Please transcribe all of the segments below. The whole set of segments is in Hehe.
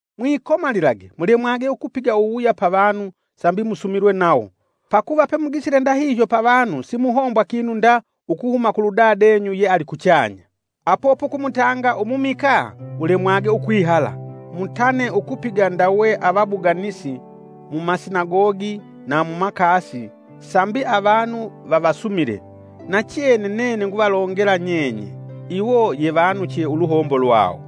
“Mwikomalilage mulemwage ukupiga uwuwuya pa vanu sambi musumilwe nawo. Pakuva pemugisile ndahihyo pavanu, simuhombwa kinu nda ukuhuma kuludadenyu yealikuchanya.” “Apo pukumutanga umumikaa ulemwage ukwihala. Mutane ukupiga ndawe avabuganisi mumasinagogi na mumakasi sambi avanu vavasumile. Nachene nene nguvalongela nyenye, iwo yevanuche uluhombo lwawo.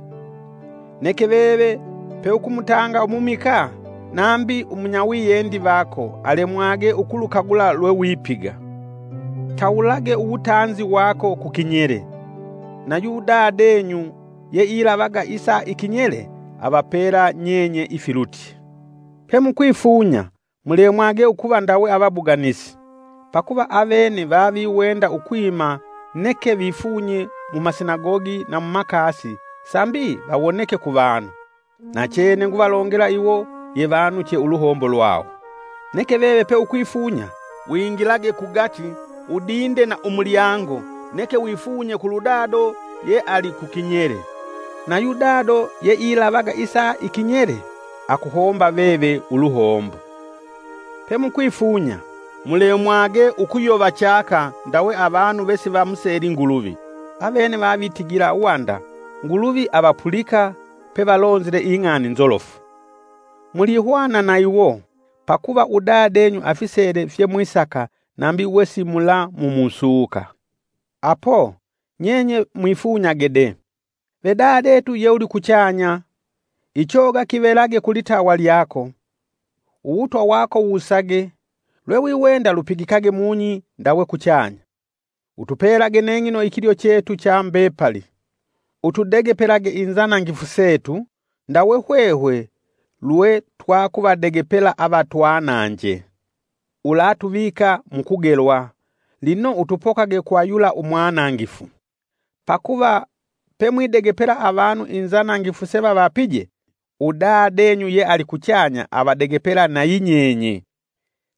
Neke veve peukumutanga umumikaa, nambi umunyawiyendi vako alemwage ukulukagula lwewipiga. Tawulage uwutanzi wako kukinyele, na yudadenyu yeilavaga isa ikinyele avapela nyenye ifilutye. “Pe mukwifunya, mulemwage ukuva ndawe avabuganisi. Pakuva avene vaviwenda ukwima neke vifunye mumasinagogi na mumakasi sambi vawoneke kuvanu. Nachene nguvalongela iwo yevanuche uluhombo lwawo. Neke veve peukwifunya, wingilage kugati, udinde na mulyango, neke wifunye kuludado yeali kukinyele. Na yudado yeilavaga isa ikinyele akuhomba veve uluhombo. “Pe mukwifunya, mulemwage ukuyova chaka ndawe avanu vesivamuseli Nguluvi. Avene vavitigila wanda Nguluvi avapulika pevalonzile ing'ani nzolofu. Mulihwana na iwo. Pakuva udadenyu afisele fyemwisaka nambi wesimulamumusuka. Apo, nyenye mwifunyage de: ‘Ve dadetu ye ulikuchanya: Ichoga kivelage kulitawa lyako; Uwutwa wako wusage, lwewiwenda lupigikage mung'i ndawe kuchanya. Utupelage neng'ino ikilyo chetu cha mbepali. Utudegepelage inzanangifu setu, ndawe hwehwe lwe twakuvadegepela avatwananje. Ulatuvika mu kugelwa, lino utupokage kwa yula Umwanangifu.’ “Pakuva pemwidegepela avanu inzanangifu sevavapije, udadenyu yealikuchanya avadegepela nayi nyenye.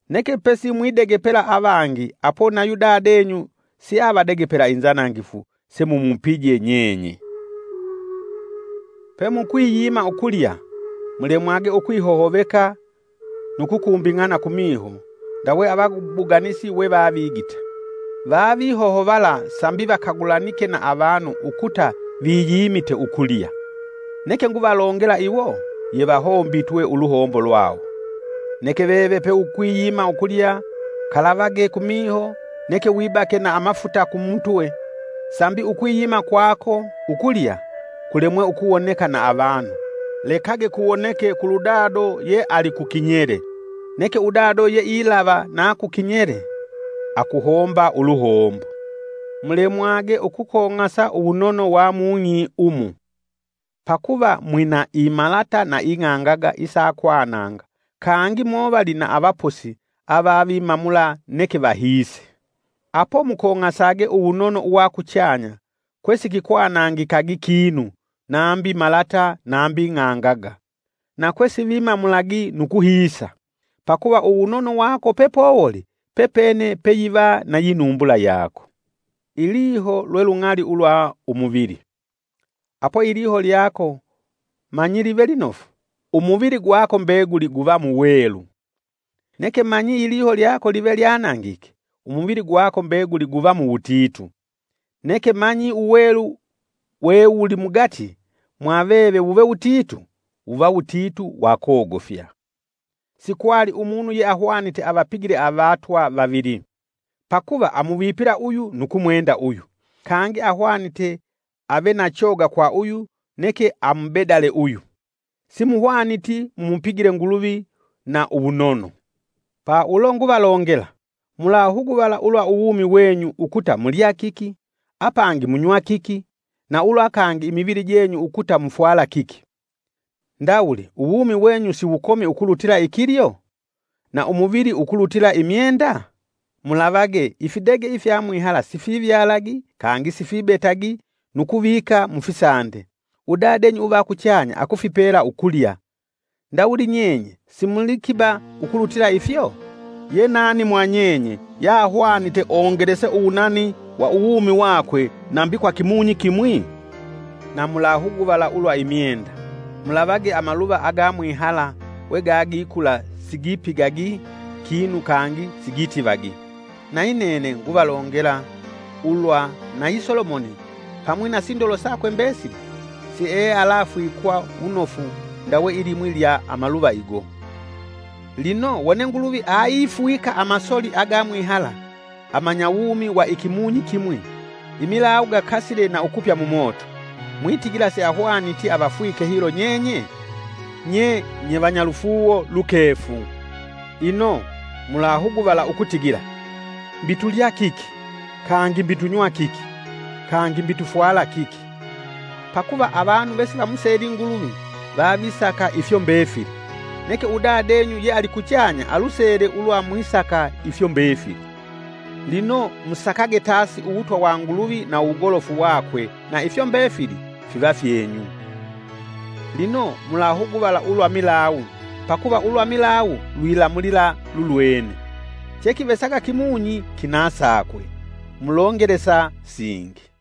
Neke pesimwidegepela avangi apo nayu Dadenyu siavadegepela inzanangifu semumupije nyenye.” “Pemukwiyima ukulya, mulemwage ukwihohoveka nu kukumbing'ana kumiho ndawe avabuganisi we vavigita. Vavihohovala sambi vakagulanike na avanu ukuta viyimite ukulya. Nene nguvalongela iwo yevahombitwe uluhombo lwawo. Neke veve peukwiyima ukulya, kalavage kumiho neke wibake na amafuta kumutwe, sambi ukwiyima kwako ukulya, kulemwe ukuwoneka na avanu, lekage kuwoneke kuludado ye alikukinyele. Neke udado yeailava na kukinyele akuhomba uluhombo.” “Mulemwage ukukong'asa uwunono wa mung'i umu, pakuva mwina imalata na ing'angaga isakwananga kangi movali na avaposi avavimamula neke vahiise. Apo mukong'asage uwunono uwa kuchanya kwe sikikwanangikagi kinu nambi malata nambi ng'angaga, na kwe sivimamulagi nu kuhiisa. Pakuva, uwunono wako pepowoli pepene peyiva nayi numbula yako. “Iliho lwe lung'ali ulwa umuvili. Apo iliho lyako manyi live linofu, umuvili gwako mbeguli guva muwelu. Neke manyi iliho lyako live lyanangike, umuvili gwako mbeguli guva muwutitu. Neke manyi uwelu wewulimugati mwaveve wuve wutitu, wuva wutitu wa kogofya.” “Sikwali umunu yeahwanite avapigile avatwa vavili. Pakuva amuvipila uyu nu kumwenda uyu. Kangi ahwanite ave na choga kwa uyu neke amubedale uyu. Si muhwaniti mumupigile Nguluvi na uwunono.” “Pa ulo nguvalongela, mulahuguvala ulwa uwumi wenyu ukuta mulya kiki, apangi munywa kiki, na ulwa kangi imivili jenyu ukuta mufwala kiki. Ndawuli uwumi wenyu siwukomi ukulutila ikilyo? Na umuvili ukulutila imyenda? Mulavage ifidege ifya mwihala sifivyalagi, kangi sifibetagi nu kuvika mufisande. Udadenyu uva kuchanya akufipela ukulya. Ndawuli nyenye simulikiba ukulutila ifyo? Yenani mwa nyenye yahwanite ongelese uwunani wa uwumi wakwe nambi kwa kimunyi kimwi? Na mulahuguvala ulwa imyenda, mulavage amaluva agamwihala wegagikula sigipigagi kinu kangi sigitivagi. Nayi nene nguvalongela, ulwa nayi Solomoni pamwi na sindolo sakwe mbesili siealafwikwa wunofu ndawe ilimwi lya amaluva igo. Lino wone Nguluvi aifwika amasoli agamwihala amanyawumi wa ikimunyi kimwi, imilawu gakasile na ukupya mumoto, mwitigila siahwaniti avafwike hilo nyenye? Nye nyevanyalufuuwo lukefu! Ino, mulahuguvala ukutigila, ‘Mbi tulya kiki, kangi mbi tunywa kiki, kangi mbi tufwala kiki!’” Pakuva avanu vesivamuseli Nguluvi vavisaka ifyo mbefili. Neke udadenyu yealikuchanya alusele ulwa mwisaka ifyo mbefili. Lino musakage tasi uwutwa wa Nguluvi na uwugolofu wakwe na ifyo mbefili fiva fyenyu. Lino mulahuguvala ulwa milawu; pakuva ulwa milawu lwilamulila lulwene. Chekivesaga kimunyi kina sakwe, mulongelesa singi.